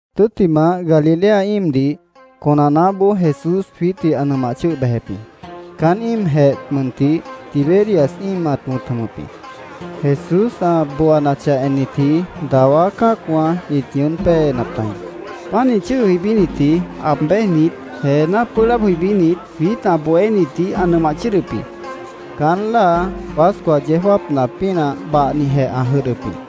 Tʉ́ttimah, Galilea íimdih conanaáboó Jesús jwiítdih ã nʉmah chʉ́ʉh bejep jĩ. Caán íimjeh mʉntih Tiberias íim ã wʉ̃t jʉmʉp jĩ. Jesús ã booanachah ennitji dawá cã́acwã ĩt ñʉʉ́n péenap tajĩ. Pánih chʉ́ʉh jʉibínitji, aab béjnit, jeená pʉ́ʉh laab jʉibínit, jwiít ã bohénitdih ã nʉmah chʉ́ʉdʉp jĩ. Caán láa Pascua yeó jáapna pínah bahnijeh ã jʉdhdʉp jĩ.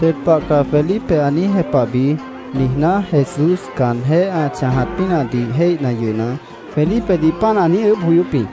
“Ded pah caá Felipe ã niíj jepahbi”, niijná, Jesús caanjéh ã chãjat pínahdih jéihna yʉhna, Felipedih páant ã niíj ʉʉ́bh joyóp jĩ.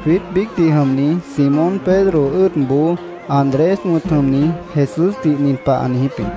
Jwiít biícdih jʉmni Simón Pedro ʉ́ʉdboó, Andrés wʉ̃t jʉmni, Jesúsdih nin pah ã niijíp jĩ: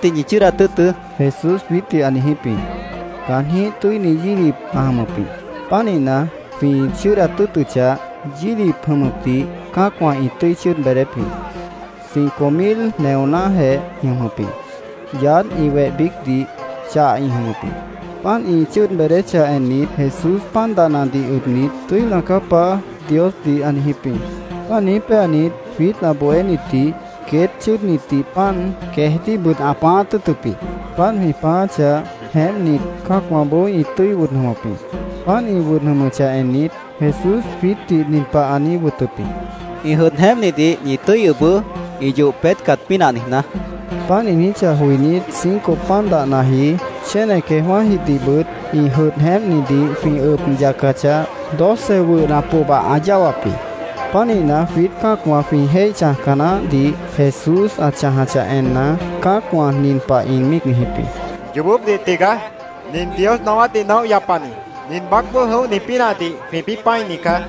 —Queétdih ñi chʉ́ʉdat tʉ́ʉtʉ́, Jesús jwiítdih ã niijíp jĩ. Caanjĩ́h tʉ́ini yílip ã jʉmʉp jĩ. Pánihna, jwĩ chʉ́ʉdat tʉ́ʉtʉchah, yílip jʉmʉpdih cã́acwã ĩ tʉ́i chʉ́ʉd beedép jĩ. Cinco mil neonájeh ĩ jʉmʉp jĩ. Yaádh, ĩ weh biícdih chah ĩ jʉmʉp jĩ. Páant ĩ chʉ́ʉd beedéchah ennit, Jesús pan dahnadih ʉbnit, “Tʉ́ina caá, Paá”, Diosdih ã niijíp jĩ. Páant niíj péanit, jwiít ã bohénitdih queét chʉ́ʉdnitdih pan, queejdíhbʉt ã pãáát tʉ́ʉtʉp jĩ. Páant jwĩ pãááchah, jeémpnit, cã́acwãboó ĩ tʉ́i wʉd jʉmʉp jĩ. Páant ĩ wʉd jʉmʉchah ennit, Jesús jwiítdih nin pah ã niíj wʉtʉp jĩ: —Ĩ jʉdh jeémpnidih ñi tʉ́i ʉbʉʉ́, ĩ yoh peétcat pínah niijná, ã niijíp jĩ. Páant ã niijíchah joinít, cinco pan dahnaji, chéne queejwã́jidihbʉt ĩ jʉdh jeémpnidih jwĩ ʉb yacachah, doce wʉhna pohba ã yáwap jĩ. Pánihna, jwiít cã́acwã jwĩ jéih chãjca naáhdih Jesús ã chãjachah enna, cã́acwã nin pah ĩ míic niijíp jĩ: —Yoobópdih tigaá. Nin Dios naáwátdih naóh yapani, nin baácboó jʉ̃óhni pínahdih jwĩpĩ́ pã́ini caá,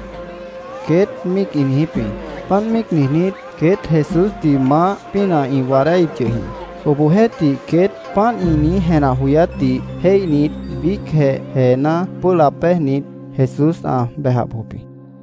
queét ĩ míic niijíp jĩ. Páant míic niijnít, queét Jesúsdih maáh pínah ĩ waadáíhip yʉh jĩ. Obohjeéhtih, queét páant ĩ niíj jenah joyátdih jéihnit, biícjeh jeená pʉ́ʉh laab béjnit, Jesús ã bejah bojop jĩ.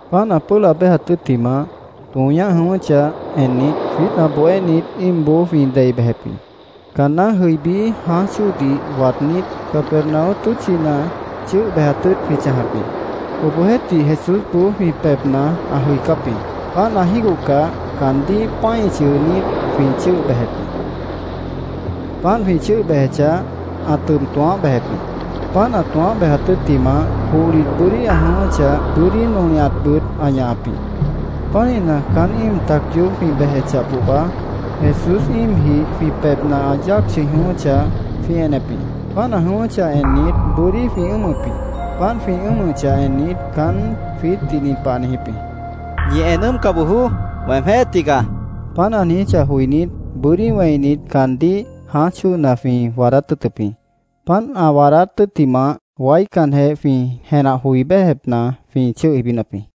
Páant ã pʉ́ʉh laab béjat tʉ́ttimah, tõo ñáh jʉ̃ʉ́wʉ́chah ennit, jwiít ã bohénit íimboó jwĩ dei bejep jĩ. Caanná jʉibí, jãáj chóodih waadnít, Capernaum tʉ́tchina chʉ́ʉh bejat tʉ́ʉt jwĩ chãjap jĩ. Obohjeéhtih, Jesúsboó jwĩ pebhna ã jʉicáp jĩ. Páant ã jígohcah, caandíh pã́i chʉʉnít, jwĩ chʉ́ʉh bejep jĩ. Páant jwĩ chʉ́ʉh bejechah, ã tʉb tõoáh bejep jĩ. Páant ã tõoáh bejat tʉ́ttimah, johlit bʉ́dí ã jʉ̃ʉ́wʉ́chah, bʉ́dí nolihatbʉt ã ñahap jĩ. Pánihna, caán íim tac yoób jwĩ bejechah pohba, Jesús íimjih jwĩ pebhna ã yáac chʉ̃i jʉ̃ʉ́wʉ́chah, jwĩ enep jĩ. Páant ã jʉ̃ʉ́wʉ́chah ennit, bʉ́dí jwĩ ʉ́ʉmʉp jĩ. Páant jwĩ ʉ́ʉmʉchah ennit, caán jwiítdih nin pah ã niijíp jĩ: —¡Ñi en ʉ́ʉmca bojoó! ¡Weemjéh tigaá! ã niijíp jĩ. Páant ã niijíchah joinít, bʉ́dí wẽinit, caandíh jãáj chóona jwĩ waadát tʉ́ʉtʉp jĩ. Páant ã waadát tʉ́ttimah, waícanjeh jwĩ jenah joi béjepna jwĩ chʉ́ʉh jʉibínap jĩ.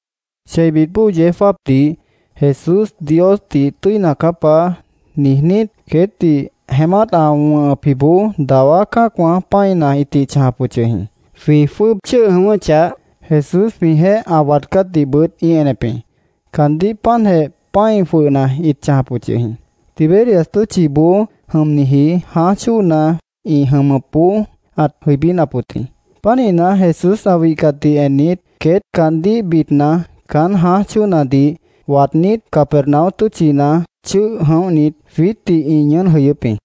Cheibit bóo yeó jáapdih Jesús Diosdih “Tʉ́ina caá, Paá”, niijnít, queétdih jeémát ã wʉ̃hʉpjiboó dawá cã́acwã pã́ina ĩtih chãjap wʉt yʉh jĩ. Jwĩ jwʉ́ʉb chʉ́ʉh jʉ̃ʉ́wʉ́chah, Jesús jwĩjeéh ã waadcátdihbʉt ĩ enep jĩ. Caandíh páantjeh pã́i jwʉhna ĩt chãjap wʉt yʉh jĩ. Tiberias tʉ́tchiboó jʉmniji jãáj chóona ĩ jʉmʉpboó ãt jʉibínap wʉt jĩ. Pánihna, Jesús ã wihcatdih ennit, queét caandíh bidna, caán jãáj chóonadih waadnít, Capernaum tʉ́tchina chʉ́ʉh jʉ̃óhnit, jwiítdih ĩ ñʉʉ́n jʉyʉ́p jĩ.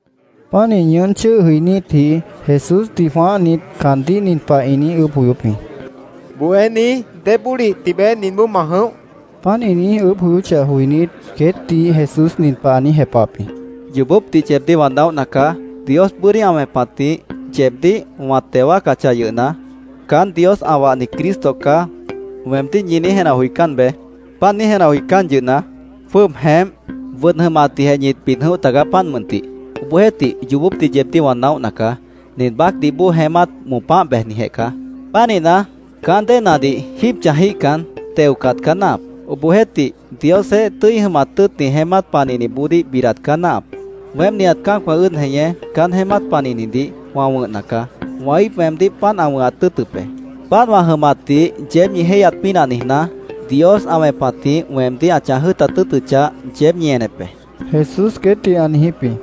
Pánih ñʉʉ́n chʉ́ʉh jʉinítji, Jesúsdih jwãáhnit, caandíh nin pah ĩ niíj ʉʉ́bh joyóp jĩ: —¿Bohéní, débólih tibeé ninboó ma jʉ̃óh? ĩ niijíp jĩ. Páant ĩ niíj ʉʉ́bh joyóchah joinít, queétdih Jesús nin pah ã niíj jepahap jĩ: —Yoobópdih yeebdíh wã naóhna caá. Dios bʉ́dí ã wẽpatjĩh yeebdíh wã teo wáacachah yʉhna, ‘Caán Dios ã wahni Cristo caá’, weemdíh ñi niíj jenah joicán beé. Páant niíj jenah joicán yʉhna, jwʉ́ʉb jeémp, wʉd jʉmatdihjeh ñit bid jʉ̃óh tagaá, páant mʉntih. Obohjeéhtih, yoobópdih yeebdíh wã naóhna caá. Nin baácdih bóo jeémát moopáh bejnijeh caá. Pánihna, caán déenadih jíib chãjíhcan, teocat caá náahap. Obohjeéhtih, Diosjeéh tʉ́i jʉmat tʉ́ʉtni jeémát panihniboodíh bidat caá náahap. Weém nihat cã́acwã ʉ́ʉd jeñé caán jeémát panihnidih wã wʉ̃hna caá. Wã íip weemdíh páant ã wʉ̃hat tʉ́ʉtʉp be. Páant wã jʉmatdih yeéb ñi jéihyat pínah niijná, Dios ã wẽpatjĩh weemdíh ã chãj jʉ́ʉtat tʉ́ʉtʉchah, yeéb ñi enep be, Jesús queétdih ã niijíp jĩ.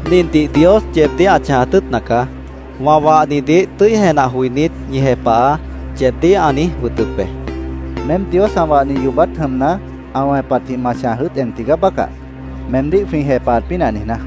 —Nindih Dios yeebdíh ã chãjat tʉ́ʉtna caá: ‘Wã wahnidih tʉ́i jenah joinít, ñi jepahaá’, yeebdíh ã niíj wʉtʉp be, Jesús queétdih ã niijíp jĩ. —Meém Dios ã wahni yoobát jʉmna, ã wẽpatjĩh ma chãj jʉ́ʉt en tigaá bácah, meemdíh jwĩ jepahat pínah niijná.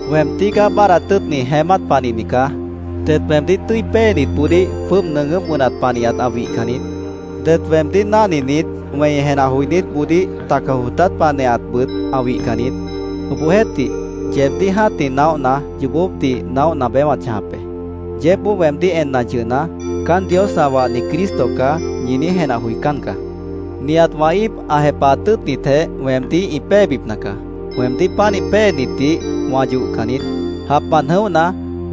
—Weem tígaá báadhdat tʉ́ʉtni jeémát panihni caá. Det weemdíh tʉ́i péenitboodíh jwʉ́ʉb nʉʉgʉ́p wʉnat panihat ã wihcan niít. Det weemdíh náhninit, wẽi jenah joinítboodíh taca jootát panihatbʉt ã wihcan niít. Obohjeéhtih, yeebdíh jã́tih naóhna, yoobópdih naóhna beé wã chãjap be. Yeébboó weemdíh enna yʉhna, ‘Caán Dios ã wahni Cristo caá’, ñi niíj jenah joicán caá. Nihat wã íip ã jepahat tʉ́ʉtnitjeh weemdíh ĩ péebipna caá. Weemdíh pánih péenitdih wã yohcan niít. Japmant jʉ̃óhna,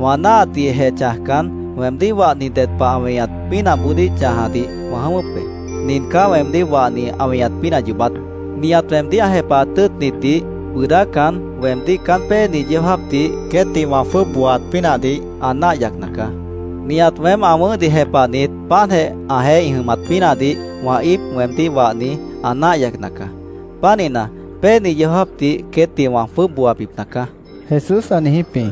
wã náahatdihjeh chãjcan, weemdíh wahni ded pah ã weñat pínahboodíh chãjadih wã jʉ̃ʉ́wʉ́p be. Nin caá weemdíh wahni ã weñat pínah yoobát: Nihat weemdíh ã jepahat tʉ́ʉtnitdih bʉʉdácan, weemdíh caán péeni yeó jáapdih queétdih wã jwʉ́ʉb booaat pínahdih ã náah yacna caá. Nihat weém ã wʉ̃ʉ́hdih jepahnit, páantjeh ãjeéh ĩ jʉmat pínahdih wã íip, weemdíh wahni, ã náah yacna caá. Pánihna, péeni yeó jáapdih queétdih wã jwʉ́ʉb booabipna caá, Jesús ã niijíp jĩ.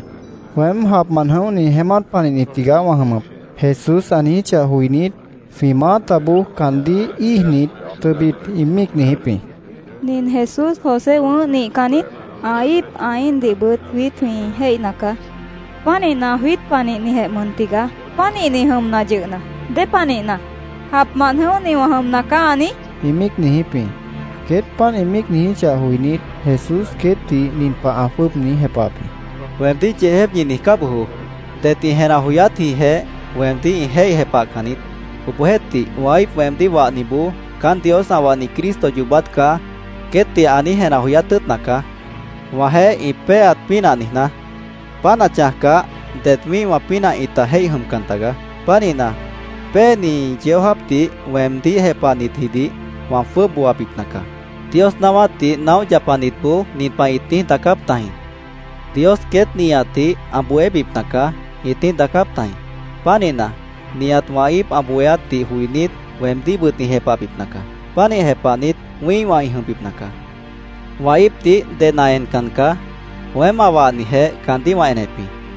“Weém japmant jʉ̃óhni jeémát panihni tigaá wã jʉmʉp”, Jesús ã niijíchah joinít, jwĩ maátaboó caandíh íijnit, tʉbit ĩ míic niijíp jĩ. —¿Nin Jesús José wʉ̃ʉ́h nihcan niít? Ã íip, ã íindihbʉt jwiít jwĩ jéihna caá. Pánihna, jwiít panihnijeh mʉn tigaá. Pánihni jʉmna yʉhna, ¿dépanihna “Japmant jʉ̃óhni wã jʉmna caá”, ã niíj? ĩ míic niijíp jĩ. Queét páant ĩ míic niijíchah joinít, Jesús queétdih nin pah ã jwʉ́ʉb niíj jepahap jĩ: —Weemdíh yeejép ñi niijcá bojoó. Det ĩ jenah joyátjĩhjeh weemdíh ĩ jéih jepahcan niít. Obohjeéhtih, wã íip, weemdíh wahniboó, ‘Caán Dios ã wahni Cristo yoobát caá’, queétdih ã niíj jenah joyát tʉ́ʉtna caá, wãjeéh ĩ péeat pínah niijná. Páant ã chãjcah, det wĩ́ihwã pínah ĩta jéih jʉmcan tagaá. Pánihna, péeni yeó jáapdih weemdíh jepahnitjidih wã jwʉ́ʉb booabipna caá. Dios naáwátdih naóh yapanitboó nin pah ĩt niíj daacáp tajĩ. ‘Dios queét nihatdih ã bohébipna caá’, ĩt niíj daacáp tajĩ.Pánihna, nihat wã íip ã bohéátdih joinít, weemdíhbʉt ĩ jepahbipna caá. Pánih jepahnit wĩ́ihwã ĩ jʉmbipna caá. “Wã íipdih ded ã encan caá. Weém ã wahnijeh caandíh wã enep jĩ.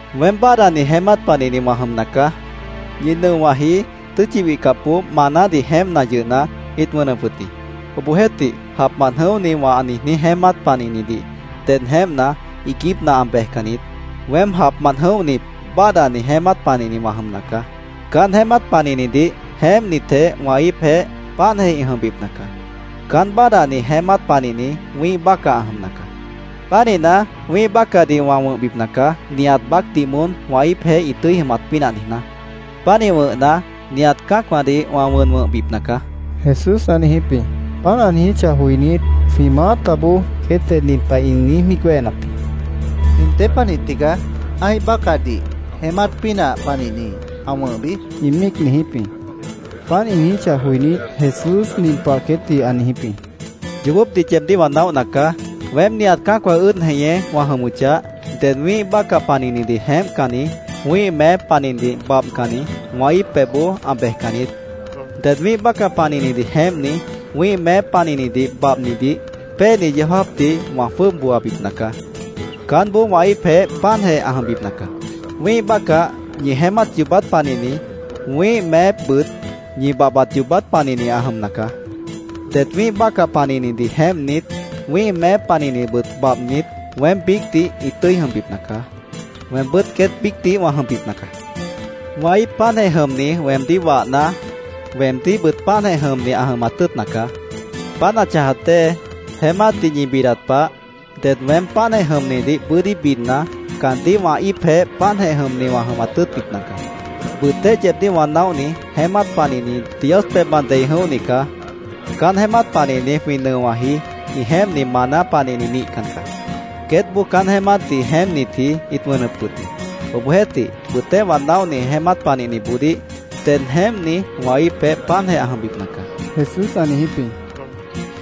Weém báadhdani jeémát panihni wã jʉmna caá. Ñi nʉowãji tʉ́tchi wihcapboó manádih jeémpna yʉhna, ĩt wʉnʉp wʉt jĩ. Obohjeéhtih, japmant jʉ̃óhni wã niijní jeémát panihnidih ded jeémpna, iiguípna ã bejcan niít. Weém japmant jʉ̃óhni báadhdani jeémát panihni wã jʉmna caá. Caán jeémát panihnidih jeémpnitjeh wã íipjeéh páantjeh ĩ jʉmbipna caá. Caán báadhdani jeémát panihni wĩ́ih bácah ã jʉmna caá. Pánihna, wĩ́ih bácahdih wã wʉ̃hbipna caá, nihat baácdih moón wã íipjeéh ĩ tʉ́i jʉmat pínah niijná. Pánih wʉ̃hna, nihat cã́acwãdih wã wʉn wʉ̃hbipna caá”, Jesús ã niijíp jĩ. Páant ã niijíchah joinít, jwĩ maátaboó, queétjeh nin pah ĩ niíj míic wéhenap jĩ: —¿Nin dépanih tigaá ã́ih bácahdih jeémát pínah panihni ã wʉ̃hbi? ĩ míic niijíp jĩ. Páant ĩ niijíchah joinít, Jesús nin pah queétdih ã niijíp jĩ: —Yoobópdih yeebdíh wã naóhna caá. Weém nihat cã́acwã ʉ́ʉd jeñé wã jʉmʉchah, ded wĩ́ih bácah panihnidih jeémpcanni, wĩ́ih meép panihnidih babhcanni wã íip pebhboó ã bejcan niít. Ded wĩ́ih bácah panihnidih jeémpni, wĩ́ih meép panihnidih babhnidih péeni yeó jáapdih wã jwʉ́ʉb booabipna caá. Caánboó wã íipjeéh páantjeh ã jʉmbipna caá. Wĩ́ih bácah ñi jeémát yoobát panihni, wĩ́ih meépbʉt ñi babhbat yoobát panihni ã jʉmna caá. Det wĩ́ih bácah panihnidih jeémpnit, wĩ́ih meép panihnidihbʉt babhnit, weém biícdih ĩ tʉ́i jʉmbipna caá. Weembʉ́t queét biícdih wã jʉmbipna caá. Wã íip páantjeh jʉmni weemdíh wahna, weemdíhbʉt páantjeh jʉmni ã jʉmat tʉ́ʉtna caá. Páant ã chãjat dée, jeémátdih ñi bidat pah, ded weém páantjeh jʉmnidih bʉ́dí bidna, caandíh wã íipjeéh páantjeh jʉmni wã jʉmat tʉ́ʉtbipna caá. Bʉtéh yeebdíh wã naóhni jeémát panihni Dios pebhmant dei jʉ̃óhni caá. Caán jeémát panihni jwĩ nʉowãji ĩ jeémpni maná panihni nihcan caá. Queétboó caán jeémátdih jeémpnitji ĩt wʉnʉp wʉt jĩ. Obohjeéhtih, bʉtéh wã naóhni jeémát panihniboodíh ded jeémpni wã íipjeéh páantjeh ã jʉmbipna caá, Jesús ã niijíp jĩ.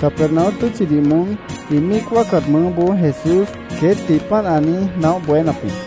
Capernaum tʉ́tchidih moón ĩ míic wáacat mʉʉ́boó Jesús queétdih páant ã niíj naóh bohénap jĩ.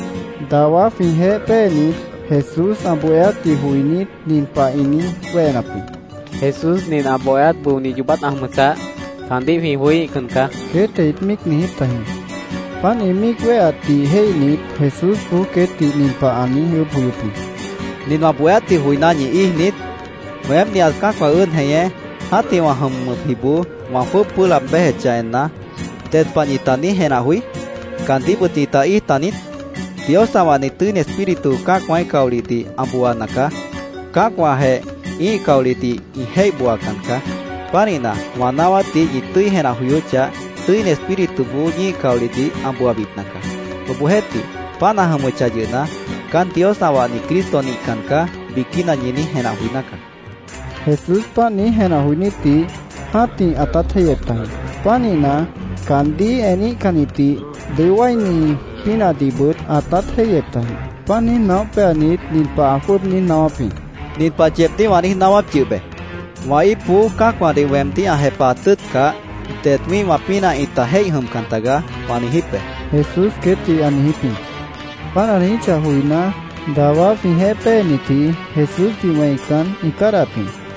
Dawá jwĩjeéh péenit Jesús ã bohéátdih joinít, nin pah ĩ niíj wéhenap jĩ: —Jesús nin ã bohéát bʉoni yoobát ã jʉmʉchah, caandíh jwĩ joííhcan caá, queétjeh ĩt míic niijíp tajĩ. Páant ĩ míic wéheatdih jéihnit, Jesúsboó queétdih nin pah ã niíj ʉʉ́bh joyóp jĩ: —¿Nin wã bohéátdih joiná, ñi íij niít? Weém, nihat cã́acwã ʉ́ʉd jeñé, jã́tih wã jʉmʉpjiboó wã jwʉ́ʉb pʉ́ʉh laab béjechah enna, ¿ded pah ñita niíj jenah joí? ¿Caandíhbʉt ñita íij taniít? Dios ã wahni Tʉ́ini Espíritu cã́acwãíh caolihdih ã booana caá. Cã́acwãjeh ĩ́ih caolihdih ĩ jéih booacan caá. Pánihna, wã naáwátdih ñi tʉ́i jenah joyóchah, Tʉ́ini Espírituboó ñíih caolihdih ã booabipna caá. Obohjeéhtih, páant ã jʉmʉchah yʉhna, ‘Caán Dios ã wahni Cristo nihcan caá’, biquína ñi niíj jenah joiná caá, Jesús ã niijíp jĩ. Jesús páant niíj jenah joinítdih jã́tih ãtát jéihyep tajĩ. Pánihna, caandíh eníhcannitdih dʉó wáini pínahdihbʉt ãtát jéihyep tajĩ. Páant niíj naóh péanit, nin pah ã jwʉ́ʉb niíj naáwáp jĩ: —Nin pah yeebdíh wã niíj naáwáp yʉh be: ‘Wã íipboó cã́acwãdih weemdíh ã jepahat tʉ́ʉtcah, det wĩ́ihwã pínah ĩta jéih jʉmcan tagaá’, wã niijíp be, Jesús queétdih ã niijíp jĩ. Páant ã niijíchah joiná, dawá jwĩjeéh péenitji Jesúsdih wẽican, ĩ cádahap jĩ.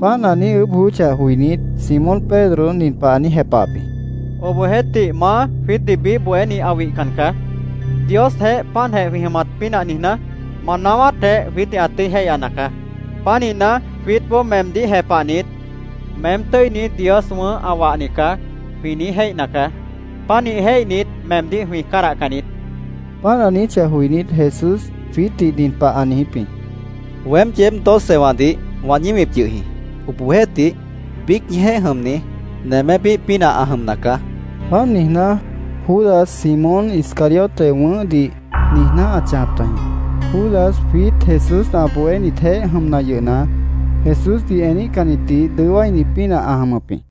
Páant ã niíj ʉʉ́bh joyóchah joinít, Simón Pedro nin pah ã niíj jepahap jĩ: —Obohjeéhtih, Maá, jwiítdih biíh bohéni ã wihcan caá. Diosjeéh páantjeh jwĩ jʉmat pínah niijná, ma naáwátjeh jwiítdih ã tʉ́i jéihyana caá. Pánihna, jwiítboó meemdíh jepahnit, ‘Meém tʉ́ini, Dios wʉ̃ʉ́h, ã wahni caá’, jwĩ niíj jéihna caá. Pánih jéihnit, meemdíh jwĩ cádahcan niít, ã niijíp jĩ. Páant ã niijíchah joinít, Jesús jwiítdih nin pah ã niijíp jĩ: —Weém yeéb docewãdih wã ñíwip yʉh jĩ. Obohjeéhtih, biíc ñijeéh jʉmni nemépíh pínah ã jʉmna caá, ã niijíp jĩ. Páant niijná, Judas, Simón Iscariote wʉ̃ʉ́hdih niijná ãt chãjap tajĩ. Judas jwiít Jesús ã bohénitjeéh jʉmna yʉhna, Jesúsdih eníhcannitdih dʉó wáini pínah ã jʉmʉp jĩ.